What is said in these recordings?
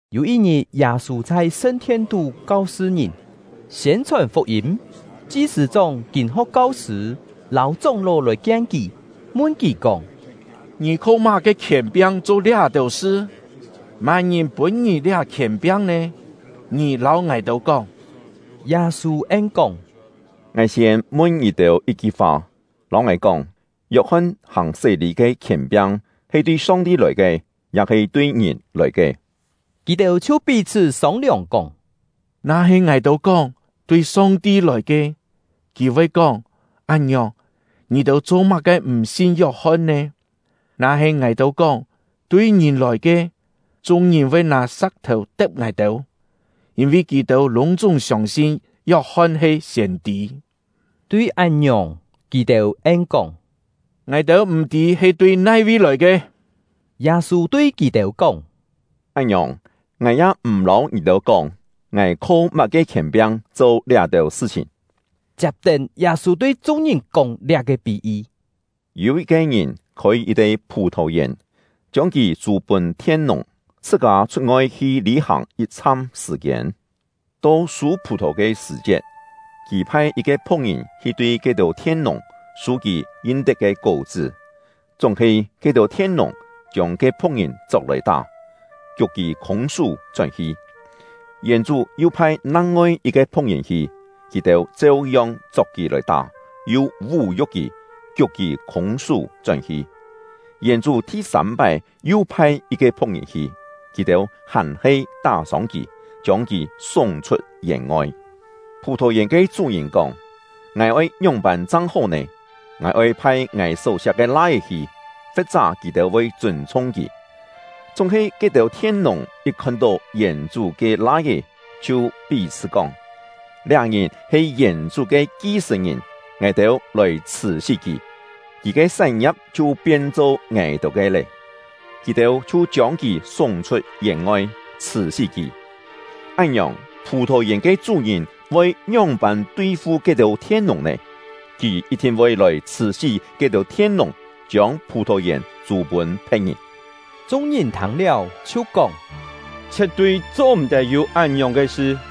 Yû yit-ngit, Yâ-sû chhai sṳn-thien-tú kau-sṳ ngìn, siên-chhòn fuk-yîm. Chi-sṳ̂-chóng, kîn-ho̍k kau-sṳ̂, lâu chóng-ló lòi-kien kì, mun kì kóng: “Ngì kho má-ke khièn-piang cho liá-têu sṳ? Má-ngìn pûn ngì liá khièn-piang nè? Ngì lâu ngài-têu kóng!” Yâ-sû en-kóng: “Ngài siên mun ngì-têu yit-ki fa; lâu ngài kóng, Yok-hon hàng sé-lî ke khièn-piang he tui Song-ti lòi ke, ya-he tui ngìn lòi ke?” Kì-têu chhiu pí-chhṳ́ sông-liòng, kóng: “Na-he ngài-têu kóng: ‘Tui Song-ti lòi ke’, kì voi kóng: ‘Án-ngiòng, ngì-têu cho-má-ke m̀ sin Yok-hon nè?’ Na-he ngài-têu kóng: ‘Tui ngìn lòi ke’, chung-ngìn voi nâ sa̍k-thèu te̍p ngài-têu, yîn-vi kì-têu lûng-chúng siông-sin Yok-hon he siên-tî.” Tui án-ngiòng, kì-têu en-kóng: “Ngài-têu m̀ tî he tui nai-vi lòi ke.” Yâ-sû tui kì-têu kóng: “Án-ngiòng, ngài ya m̀ lâu ngì-têu kóng ngài kho má-ke khièn-piang cho liá-têu sṳ-chhìn.” Chiap-tén, Yâ-sû tui chung-ngìn kóng liá-ke pí-yi: “Yû yit-ke ngìn khôi yit-te phù-thò-yèn, chiông kì chû pûn thien-nùng, chhṳ-kâ chhut-ngoi hi lî-hàng yit-chham sṳ̀-kiên. To sû phù-thò ke sṳ̀-chiet, kì phai yit-ke phu̍k-ngìn hi tui ke-têu thien-nùng sû kì yin-tet ke kó-chṳ́. Chúng-he ke-têu thien-nùng chiông ke phu̍k-ngìn chok-lòi tá, kiuk kì khûng-sú chón-hi. Yèn-chú yu phai nang-ngoi yit-ke phu̍k-ngìn hi; kì-têu cheu-yong chok kì lòi tá, yu vú-yu̍k kì, kiuk kì khûng-sú chón-hi. Yèn-chú thi-sâm-pái yu phai yit-ke phu̍k-ngìn hi; kì-têu hàn-he tá-sông kì, chiông kì súng-chhut yèn-ngoi. Phù-thò-yèn ke chú-ngìn kóng: ‘Ngài oi ngióng-pân chang hó nè? Ngài oi phai ngài só-siak ke lai-é hi, fe̍t-chá kì-têu voi chûn-chhung kì.’ Chúng-he ke-têu thien-nùng yit khon-tó yèn-chú ke lai-é, chhiu pí-chhṳ́ kóng: ‘Liá ngìn he yèn-chú ke ki-sṳ̀n-ngìn; ngài-têu lòi chhṳ̀-sí kì, kì ke sán-ngia̍p chhiu pien-cho ngài-têu ke lé!’ Kì-têu chhiu chiông kì súng-chhut yèn-ngoi, chhṳ̀-sí kì. “Án-ngiòng, phù-thò-yèn ke chú-ngìn voi ngióng-pân tui-fu ke-têu thien-nùng nè? Kì yit-thin voi lòi chhṳ̀-sí ke-têu thien-nùng, chiông phù-thò-yèn chû pûn phe̍t-ngìn.” Chung-ngìn thâng-liáu, chhiu kóng: “Chhie̍t-tui cho-m̀-tet yû án-ngiòng ke sṳ!”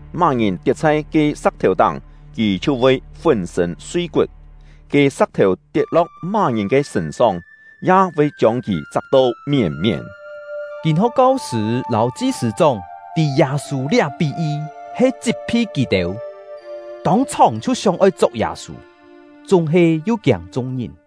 Má-ngìn tiet chhai ke sa̍k-thèu-táng, kì chhiu voi fún-sṳ̂n sui-kut; ke sa̍k-thèu tiet-lo̍k má-ngìn ke sṳ̂n-song, ya voi chiông kì chak-to mièn-mièn.” Kîn-ho̍k kau-sṳ̂ lâu chi-sṳ̂-chóng tî Yâ-sû liá pí-yi he chit-phi kì-têu, tông-chhòng chhiu sióng-oi chok Yâ-sû; chúng-he yu kiâng chung-ngìn.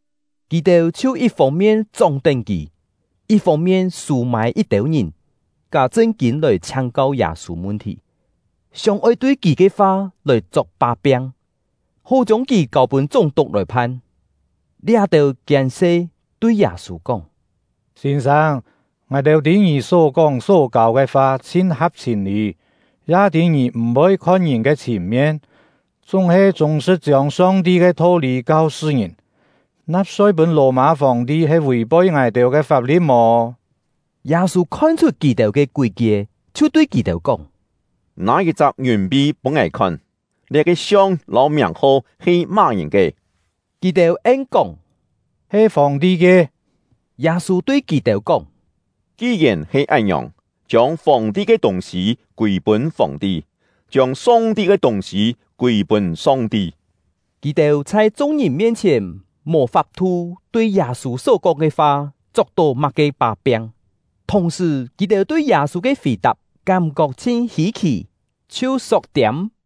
Kì-têu chhiu yit fông-mien chóng-tén kì; yit fông-mien sû-mâi yit-têu ngìn, ká chṳn-kîn lòi chhiáng-kau Yâ-sû mun-thì, sióng-oi tui kì ke fa lòi chok pá-piang, hó chiông kì kâu-pûn chúng-tuk lòi phan. Liá-têu kiên-se tui Yâ-sû kóng: “Sîn-sâng, ngài-têu tî ngì só-kóng só-kâu ke fa chhin ha̍p chhìn-lî, ya tî ngì m̀-voi khon ngìn ke chhìn-mien, chúng-he chûng-sṳ̍t chiông Song-ti ke tho-lî kau-sṳ ngìn. Na̍p-soi pûn Lò-mâ Fòng-ti he vì-poi ngài-têu ke fap-li̍t mò?” Yâ-sû khon-chhut kì-têu ke kúi-kie, chhiu tui kì-têu kóng: “Nâ yit-chak ngiùn-pi pûn ngài khon! Liá-ke siong lâu miàng-ho he má-ngìn ke?” Kì-têu en-kóng: “He Fòng-ti ke.” Yâ-sû tui kì-têu kóng: “Ki-yèn he án-ngiòng, chiông Fòng-ti ke tûng-sî kûi-pûn Fòng-ti, chiông Song-ti ke tûng-sî kûi-pûn Song-ti.” Kì-têu chhai chung-ngìn ke mien-chhièn mò fap-thu tui Yâ-sû só-kóng ke fa chok-tó má-ke pá-piang; thùng-sṳ̀, kì-têu tui Yâ-sû ke fì-tap kám-kok chhin hî-khì, chhiu sok-tiâm.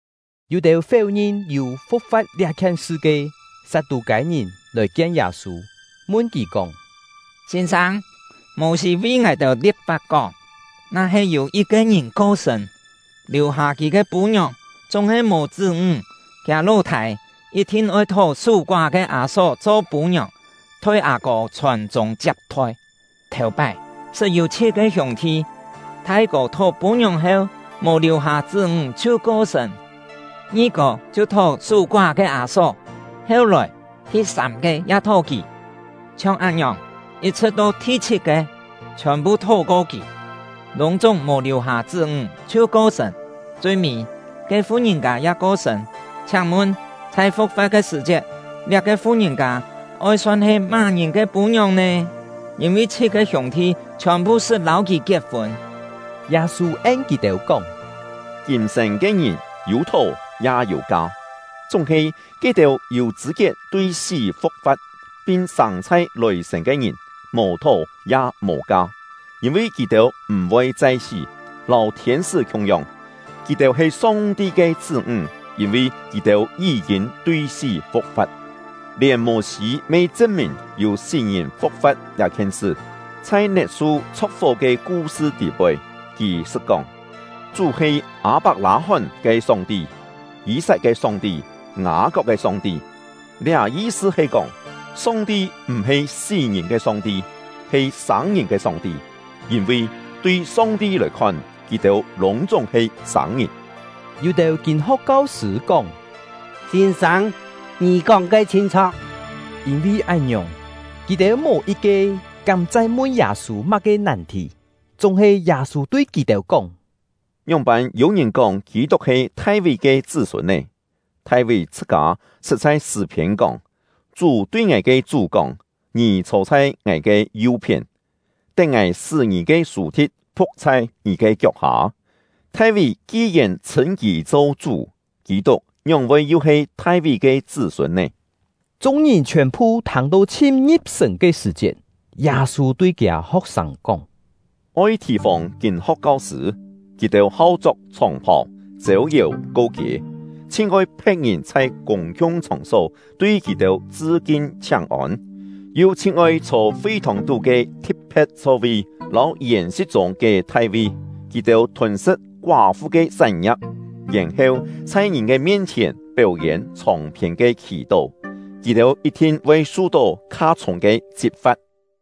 Yû-têu féu-ngin yû fu̍k-fa̍t liá-khien sṳ ke Sat-tû-kâi-ngìn lòi-kien Yâ-sû, mun kì kóng: “Sîn-sâng, Mô-sî vi ngài-têu li̍p-fap kóng: ‘Na-he yû yit-ke ngìn ko-sṳ̂n, liù-hâ kì ke pû-ngiòng, chúng-he mò chṳ́-ńg, kiâ ló-thâi yit-thin oi thó sú-koá ke â-só cho pû-ngiòng, thoi â-kô chhòn-chûng chiap-thoi.’ Thèu-pái, sṳt yû chhit-ke hiûng-thi: Thai-kô thó pû-ngiòng heu, mò liù-hâ chṳ́-ńg chhiu ko-sṳ̂n; ngi-kô chhiu thó sú-koá ke â-só; heu-lòi, thi-sâm-ke ya thó kì; chhiong án-ngiòng, yit-chhṳ̍t to thi-chhit-ke, chhiòn-phu thó-ko kì, lûng-chúng mò liù-hâ chṳ́-ńg chhiu ko-sṳ̂n. Chui-mî, ke fu-ngìn-kâ ya ko-sṳ̂n. Chhiáng-mun, chhai fu̍k-fa̍t ke sṳ̀-chiet, liá-ke fu-ngìn-kâ oi son he má-ngìn ke pû-ngiòng nè? Yîn-vi chhit-ke hiûng-thi chhiòn-phu sṳt lâu kì kiet-fûn.” Yâ-sû en kì-têu kóng: “Kîm-sên ke ngìn yû thó ya yû ka; chúng-he ke-têu yû chṳ̂-kiet tui sí fu̍k-fa̍t, pin sâng chhai lòi-sên ke ngìn, mò thó ya mò ka; yîn-vi kì-têu m̀-voi chai sí, lâu thiên-sṳ́ khiung-yong. Kì-têu he Song-ti ke chṳ́-ńg, yîn-vi kì-têu yí-kîn tui sí fu̍k-fa̍t. Lièn Mô-sî me chṳn-mìn yû sí-ngìn fu̍k-fa̍t liá-khien sṳ; chhai net-su chho̍k-fó ke ku-sṳ tî-poi, kì sṳt kóng: Chú he ‘Â-pak-lâ-hón ke Song-ti, Yî-sat ke Song-ti, Ngâ-kok ke Song-ti.’ Liá yi-sṳ he kóng, Song-ti m̀-he sí-ngìn ke Song-ti, he sâng-ngìn ke Song-ti; yîn-vi tui Song-ti lòi khon, kì-têu lûng-chúng he sâng-ngìn.” Yû-têu kîn-ho̍k kau-sṳ̂ kóng: “Sîn-sâng, ngì kóng ke chhin chho̍k!” Yîn-vi án-ngiòng, kì-têu mò yit-ke kám chai mun Yâ-sû má-ke nàn-thì. Chúng-he, Yâ-sû tui kì-têu kóng: “Ngióng-pân yû-ngìn kóng Kî-tuk he Thai-ví ke chṳ́-sûn nè? Thai-ví chhṳ-kâ sṳt chhai Sṳ̂-phiên kóng: Chú tui ngài ke Chú kóng: ‘Ngì chhô chhai Ngài ke yu-phién, tén Ngài sṳ́ ngì ke sù-thi̍t phu̍k chhai ngì ke kiok-hâ.’ Thai-ví ki-yèn chhṳ̂n kì cho ‘Chú’, Kî-tuk ngióng-voi yu he Thai-ví ke chṳ́-sûn nè?” Chung-ngìn chhiòn-phu thâng-to chhin ngi̍p-sṳ̀n ke sṳ̀-chiet, Yâ-sû tui kiâ ho̍k-sâng kóng: “Oi thì-fòng kîn-ho̍k kau-sṳ̂; kì-têu hau chok chhòng-phàu, chêu-yèu ko-kiê, chhin oi phe̍t-ngìn chhai kûng-khiung chhòng-só tui kì-têu chṳ-kin chhiáng-ôn, yu chhin oi chhô fi-thòng-tú ke thi̍t-phe̍t chho-vi lâu yèn-si̍t chûng ke thai-vi. Kì-têu thûn-sṳ̍t koá-fu ke sán-ngia̍p, yèn-heu chhai ngìn ke mien-chhièn péu-yên chhòng-phiên ke khì-tó. Kì-têu yit-thin voi su-tó kha-chhûng ke chit-fa̍t!”